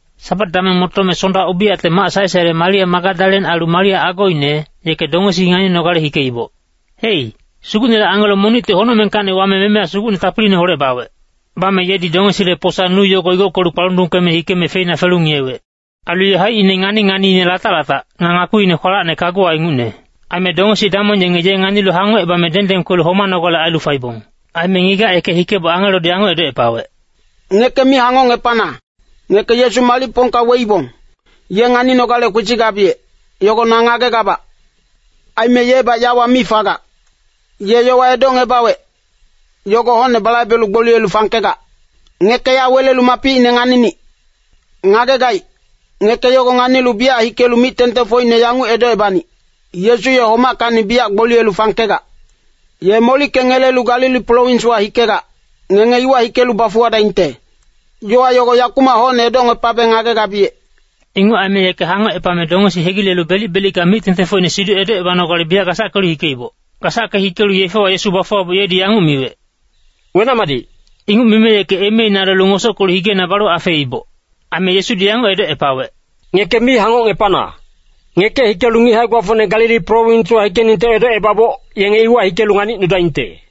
Sabat dameng motome Sonda ubiyacte mac sae-saele Maria Magadalen ailu Maria agoine, yeke dongesi nganinogale hikeiboc. Hei, Sugucnele angelo monicti honocmengkacni wame memeya sugucne tapiliineholec bawec. Bame yedi dongesile posa-nu yogo igockelu kpalundungkeme hikeme feina felu ngiyewec. Ailu ye haicine ngani-nganiine latac-latac, nga ngakpiine kwalacne kaguwa ingucne. Aime dongesi damong yenge ye nganilu hangocebame dengdeng kwelu homanogale ailu faibong. Aime ngigac yeke hikeboc angelodi yanguc edocepawec, “Ngeke mi hangocngepana, ngeke Yesu malicpongka weibong, ye nganinogale kwesigabiyec, yogo na ngagegabac. Aime yebac yawa mi fagac. Ye yowa edocngebawec, yogo hocne balaibelu gboliyelu fangkegac. Ngeke ya welelu mapicine nganinic. Ngagegaic, ngeke yogo nganilu biyac hikelu mic-tengtengfocine yanguc edocebanic, ‘Yesu ye homackacni biyac gboliyelu fangkegac. Ye molickengelelu Galili prowinswa hikegac, ngenge iwa hikelu bafuwadaingte.’ Yowa yogo yakumac hocne edocngepabe ngagegabiyec.” Inguc aime yeke hangocepame dongesi hegilelu belic-belicka mic-tengtengfocine siduc edocebanogale biyac gasackelu hikeiboc. Gasacke hikelu yefewa Yesu bafuwaboc yedi yanguc miwec, “Wenac-madic.” Inguc mime yeke emeina lelu ngosockelu higeina balu afeeiboc. Aime Yesudi yanguc edocepawec, “Ngeke mi hangocngepana. Ngeke hikelu ngic hae-gbafocne Galili prowinswa hikeningte edocebaboc, yenge iwa hikelu nganicnudaingte.”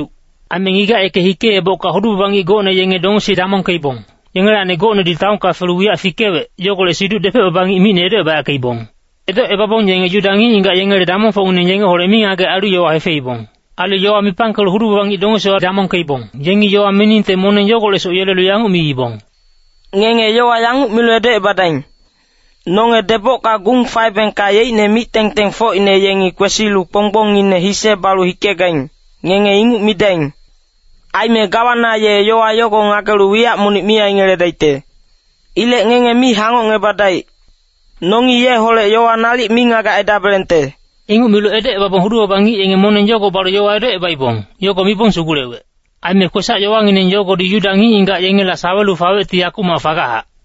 Aime ngigac yeke hikeebocka hudu-baba ngic gocne yenge dongesi damongkeibong, yengelacni gocnedi taonka felu wiyac fikewec, yogolec siduc depec-baba ngic micne edocebayackeibong. Edocebabong yenge Yuda ngic-ngigac yengele damongfocngineng yengeholec mingagec ailu yowa hefeibong. Ailu yowa mipangkelu hudu-baba ngic dongesi damongkeibong, yengi yowa miningte moneng yogolecsoc yelelu yanguc miibong, “Ngenge yowa yanguc milu edocebadaing. ‘Nonge debocka gung faebengka yeicne mic-tengtengfocine yengi kwesilu kponggbongine hise balu hikegaing,’ ngenge inguc midaing. Aime gawana ye yowa yogo ngagelu wiyac monic mi aingeledaicte. Ilec ngenge mi hangocngebadaic. Nongi yeholec yowa nalic mingagec aidabelengte.” Inguc milu edocebabong hudu-baba ngic yenge moneng yogo balu yowa edocebaibong, yogo mibong sugulewec. Aime kwesac-yowangineng yogodi Yuda ngic-ngigac yengela sawelu fawecti yakumac fagachac.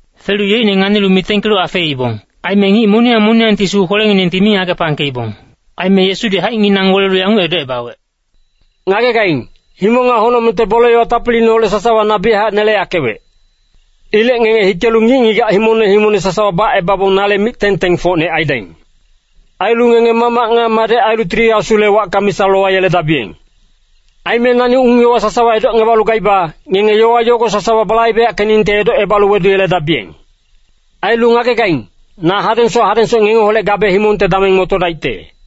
Felu yeicne nganilu mitengkelu afeeibong. Aime ngic moniyang moniyangti sugu kwelenginengti mi ngagepangkeibong. Aime Yesudi haicnginang welelu yanguc edocebawec, “Ngagegaing, himong nga honocmengte bole-yowa tapiliineholec sasawa na biyachac neleyackewec. Ilec ngenge hikelu ngic-ngigac himongne himongne sasawa bacebabong nale mic-tengtengfocne aidaing. Ailu ngenge Mamac nga Madec ailu Tili Asule wacka misa lowayeledabiyeng. Aime nani ung-yowa sasawa edocngebalu gaiba, ngenge yowa yogo sasawa balaibeyackeningte edocebalu weduyeledabiyeng. Ailu ngagegaing, na hadengsoc hadengsoc ngengeholec gabe himongte dameng motodaicte.”